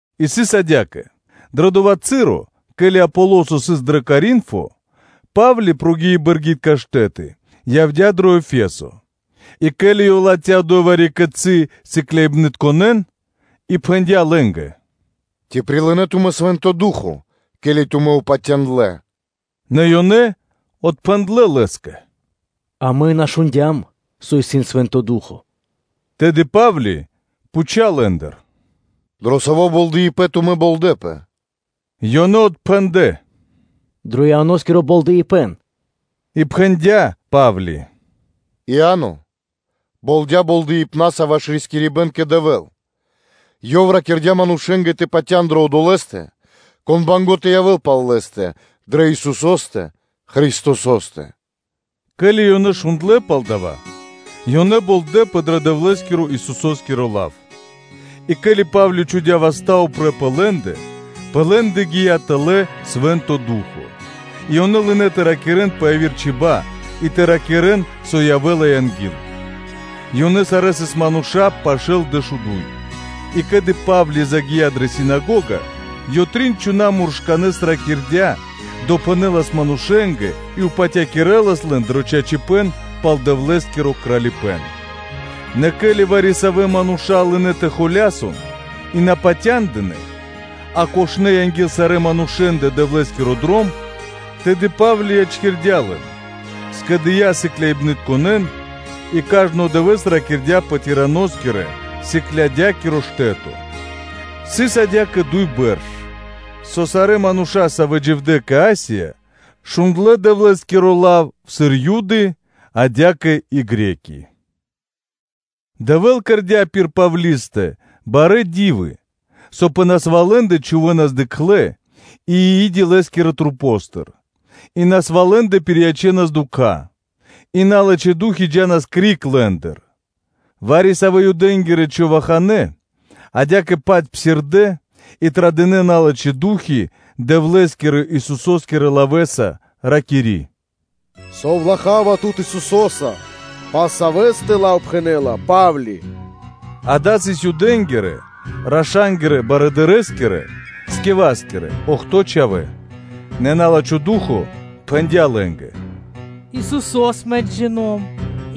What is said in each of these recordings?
И сыс адя́кэ: дро дова́ часо (цы́ро), ке́ли Аполосо сыс дро Коринфо, Па́вли, прогии бэргитка штэ́ты, явдя́ дрэ Ефесо, и ке́ли ёв латхя́ одо́й вари-кицы́ сыкляибнытконэ́н, то пхэндя́ лэ́нгэ: “Ци прилынэ́ тумэ́ Свэ́нто Ду́хо (Фа́но), ке́ли тумэ́ упатяндлэ?” Нэ ёнэ отпхэндлэ́ лэ́скэ: “Амэ и на шундя́м, со исын Свэ́нто Ду́хо (Фа́но).” Тэды Па́вли пхуця́ лэ́ндыр: “Дро саво́ болдэипэн тумэ́ болдэпэ?” Ёнэ отпхэндэ: “Дро Ианоскиро болдэипэн.” И пхэндя́ Па́вли: “Иа́но болдя болдэипнаса ваш рискирибэн кэ Дэвэ́л, ёв ракирдя́ манушэ́нгэ тэ патя́н дрэ Одолэ́стэ, Кон банго́ тэ явэ́л пал лэ́стэ, дрэ Исусо́стэ Христосо́стэ.” Ке́ли ёнэ шундлэ́ пал дава́, ёнэ болдэпэ дро Дэвлэ́скирэ-Исусо́скиро лав. И ке́ли Па́вли чхудя́ васта́ упрэ́ пэ лэ́ндэ, пэ лэ́ндэ гия́ тэлэ́ Свэ́нто Ду́хо (Фа́но), и ёнэ лынэ́ тэ ракирэ́н пэ яви́р чиба́ (чибья́) и тэ ракирэ́н, со явэ́ла анги́л. Ёнэ сарэ́ сыс мануша́ пашэ́ дэшуду́й мануша́. И ке́ли Павлия загия́ дрэ синагога, ёв трин чхона́ муршканэ́с ракирдя́, допхэнэлас манушэ́нгэ и патякирэлас лэн дрэ чачипэ́н пал Дэвлэ́скиро Кралипэ́н. Нэ ке́ли вари-савэ́ мануша́ лынэ́ тэ холясон и на патяндынэ́, а кошнэ анги́л сарэ́ манушэ́ндэ Дэвлэ́скиро Дром, тэды Па́вли ячкирдя́ лэн, скэдыя́ сыкляибнытконэ́н и кажно дывэ́с ракирдя́ пэ Тираноскирэ-сыклядякиро штэ́то. Сыс адя́кэ дуй бэрш, со сарэ́ мануша́, савэ́ дживдэ́ кэ Асия, шундлэ́ Дэвлэ́скиро лав сыр Юды, адя́кэ и Гре́ки (Баламэ́). Дэвэ́л кэрдя́ пир Павлистэ барэ́ ди́вы, со пэ насвалэндэ чхувэ́нас дыкхлэ и и́ди лэ́скирэ масэ́ндыр, и насвалэндэ пириячэнас дукха́ и налачхэ́ ду́хи джа́нас криг лэ́ндыр. Вари-савэ́ Юдэ́нгирэ човаханэ адя́кэ-паць псирдэ́ и традынэ налачхэ́ ду́хи Дэвлэ́скирэ-Исусо́скирэ лавэ́са, ракири́: “Засовлахава тут Исусо́са, пал Савэ́стэ лав пхэнэ́ла Па́вли.” Дава́ сыс Юдэ́нгирэ – раша́нгирэ барыдырэскирэ Скеваскирэ охто́ (бидуе́нгиро дэш) чхавэ́. Нэ на́лачхо ду́хо (фа́но) пхэндя́ лэ́нгэ: “Исусо́с мэ джино́м,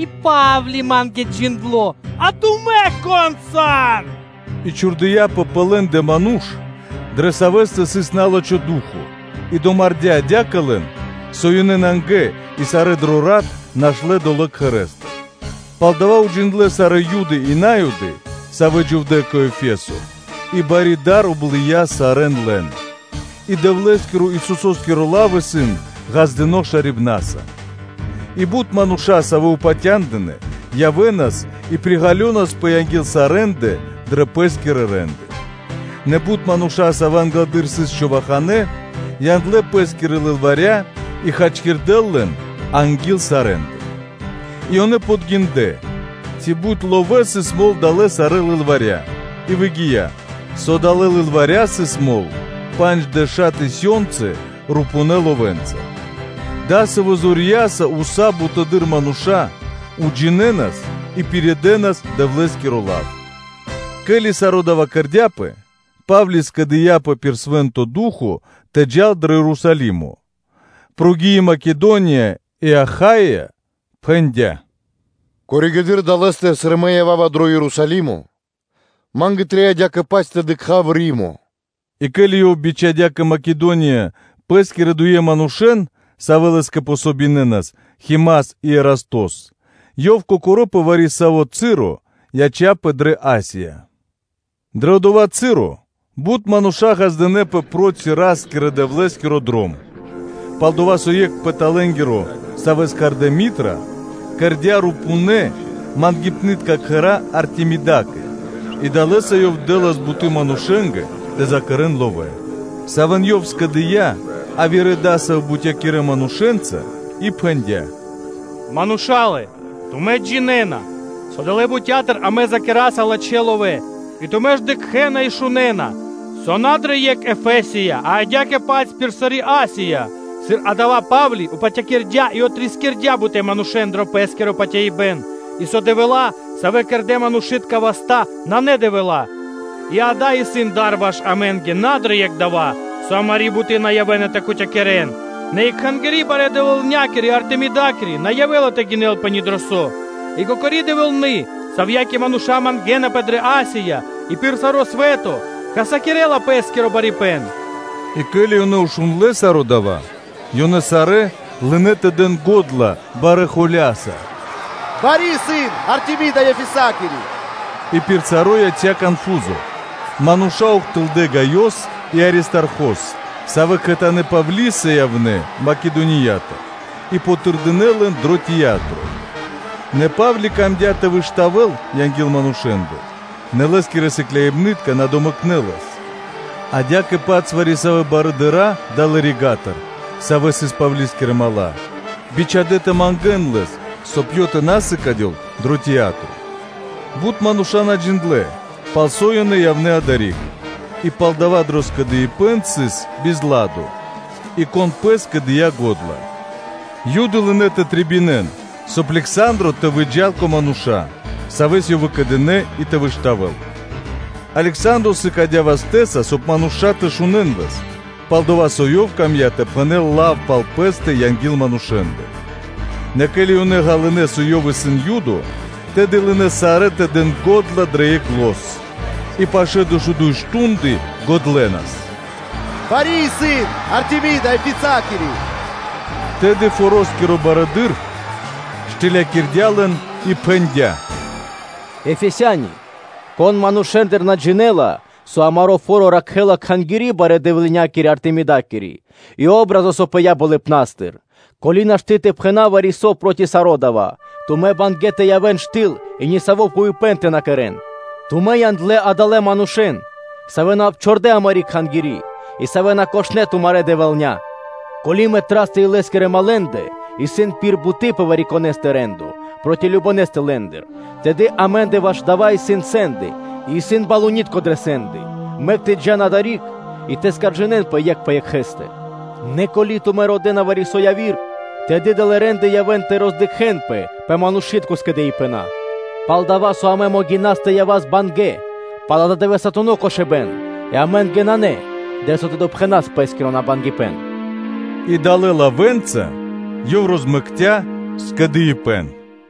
и Па́вли ма́нгэ джиндло́, а тумэ́ кон сан?” И чхурдыяпэ пэ лэ́ндэ ману́ш, дрэ савэ́стэ сыс на́лачхо ду́хо (фа́но) и домардя́ адя́кэ лэн, со ёнэ нангэ и сарэ́ дро рат нашнэ́ долэ́ кхэрэ́стыр. Пал дава́ уджиндлэ́ сарэ́ Юды и На́юды, савэ́ дживдэ́ кэ Ефесо и бари дар облыя сарэ́н лэн, и Дэвлэ́скирэ-Исусо́скирэ лавэ́скэ барьякирдэ́ паты́в. И бут мануша́, савэ́ упатя́ндынэ, явэ́нас, и приґалёнаспэ анги́л сарэ́ндэ дрэ пэ́скирэ рэ́нды. Нэ бут мануша́, савэ́ англэды́р сыс човаханэ, яндлэ́ пэ́скирэ лылваря, и хачкирдэ́ лэн анги́л сарэ́ндэ. И ёнэ подгиндлэ, ци бут ловэ́ сыс мол далэ́ сарэ́ лылваря; и выгия́, со далэ́ лылваря сыс мол панджшэла́ тысёнцы (бара́) рупувэ́ ловэ́. Дасавэ́ зорья́са уса́ бутэды́р мануша́ уджинэнас и пиридэнас Дэвлэ́скиро лав. Ке́ли саро́ дава́ кэрдя́пэ, Па́вли скэдыяпэ пир Свэ́нто Ду́хо (Фа́но) тэ джал дро Ерусалимо, прогии Македония и Ахаия, и пхэндя́: “Коригэды́р (позжэ) долэ́стыр, сыр мэ ява́ва дро Ерусалимо, ма́нгэ трэй адя́кэ-паць тэ дыкха́в Римо.” И ке́ли ёв бичхадя́ кэ Македония пэ́скирэ дуе манушэ́н, савэ́ лэ́скэ дэ́нас васт, Химас и Ерастос, ёв кокоро́ пэ вари-саво́ часо яця́пэ дрэ Асия. Дрэ одова́ часо бут мануша́ ґаздынэ́пэ проти Ра́скирэ-Дэвлэ́скиро Дром. Палдова́ со екх рупунари, савэ́с кхардэ́ Митра (Дмитриё), кэрдя́ рупунэ мангипнытка кхэра́ Артемидакэ и далэ́са ёв дэ́лас буты́ манушэ́нгэ тэ закэрэн ловэ́, савэ́н ёв скэдыя́ явирэ дасавэ́ бутякирэ манушэ́нца и пхэндя́: “Мала́лэ, тумэ́ джинэ́на, со далэ́ бутя́тыр амэ закэраса лачхэ́ ловэ́; и тумэ́ ж дыкхэ́на и шунэ́на, со на дрэ екх Ефесия, а адя́кэ-паць пир сари́ Асия, сыр адава́ Па́вли патякирдя и отрискирдя бутэ́ манушэ́н дро пэ́скиро патяибэ́н и со дэвэла́, савэ́ кэрдэ́ манушы́тка васта́, исын на дэвэла́. И дава́ исын дар ваш амэ́нгэ на дро екх дава́, со амари́ буты́ на явэ́на тэ кутякирэн, нэ и ваш кхангири́ барэ́-дэвэлнякири Артемидакири на явэ́ла тэ гинэлпэ ни дро со, и кокори дэвэлны, савьякэ мануша́ мангэ́напэ дрэ Асия и пир саро́ свэ́то хасякирэ́ла пэ́скиро райкано барипэ́н.” И ке́ли ёнэ шундлэ́ саро́ дава́, ёнэ сарэ́ лынэ́ тэ дэн го́дла барэ́ холя́са: “Бари исын Артемида Ефесакири.” И пир саро́ яця́ конфузо, мануша́ ухтылдэ́ Гаёс и Аристархос, савэ́ кхэтанэ́ Павлиса явнэ́ Македониятыр, и тырдынэ лэн дро тиятро. Нэ Па́вли камдя́ тэ выштавэл анги́л манушэ́ндэ, нэ лэ́скирэ сыкляибны́тка на домэкнэ лэс; адя́кэ-паць вари-савэ́ барыдыра́ далэ́ рига́тыр, савэ́ сыс Павлискирэ дру́ги (мала́), бичхадя́ тэ мангэ́н лэс, соб (кай) ёв тэ на сыкадёл дро тиятро. Бут мануша́ на джиндлэ́, палсо́ ёнэ явнэ́ адари́к, и палдава́ дрэ скэдыибэ́н сыс бизладо и кон пэ́скэ дыя́ го́дла. Юды лынэ́ тэ трэбинэн, соб (кай) Лександро тэ выджа́л кэ мануша́, савэ́с ёнэ выкэдынэ́ и тэ выштавэл. Лександро сыкадя́ вастэ́са, соб (кай) мануша́ тэ шунэ́н лэс, пал-дова́ со ёв камдя́ тэ пхэнэ́л лав пал пэ́стэ анги́л манушэ́ндэ. Нэ ке́ли ёнэ ґалынэ́, со ёв сыс Юдо, тэды лынэ́ сарэ́ тэ дэн го́дла дрэ екх зан, и пашэ́ дуй мардэ́ (штунды) годлэнас: “Бари исын Артемида Ефесоскири!” Тэды форо́скиро барыдыро́ штылякирдя лэн и пхэндя́: “Ефесяниялэ, кон манушэ́ндыр на джинэ́ла, со амаро́ фо́ро ракхэ́ла кхангири́ барэ́-дэвлынякири Артемидакири и патри́н (о́бразо). Ко́ли нашты́ тэ пхэна́в вари-со проти саро́ дава́, тумэ́ сан бангэ́ (мусинэна) тэ явэ́н штыл и нисаво́ фуипэ́н тэ на кэрэ́н. Тумэ́ яндлэ́ адалэ́ манушэ́н, савэ́ на обчордэ амари́ кхангири́ и савэ́ на кошнэ тумарья дэвэлня. Ко́ли Митрастэ (Дмитриёстэ) и лэ́скирэ малэндэ исын пир буты́ пэ вари-конэ́стэ рэ́ндо проти вари-конэ́стэ лэ́ндыр, тэды амэ́ндэ ваш дава́ исын сэнды, и исын балунитка (проконсулы) дрэ сэнды: мэк тэ джа́н одори́к и тэ жалинэнпэ екх пэ екхэ́стэ. Нэ ко́ли тумэ́ родэ́на вари-со яви́р, тэды далэ́ рэ́нды явэ́на тэ роздыкхэнпэ пэ манушы́тко скэдыибэна. Пал-дова́ со амэ могинаса тэ явас бангэ́ пал ададывэсатуно кошыбэ́н, и амэ́нгэ нанэ, дрэ со тэ допхэнас пэ́скиро набангипэн.” И далэ́ лавэ́нца ёв розмэкця скэдыибэ́н.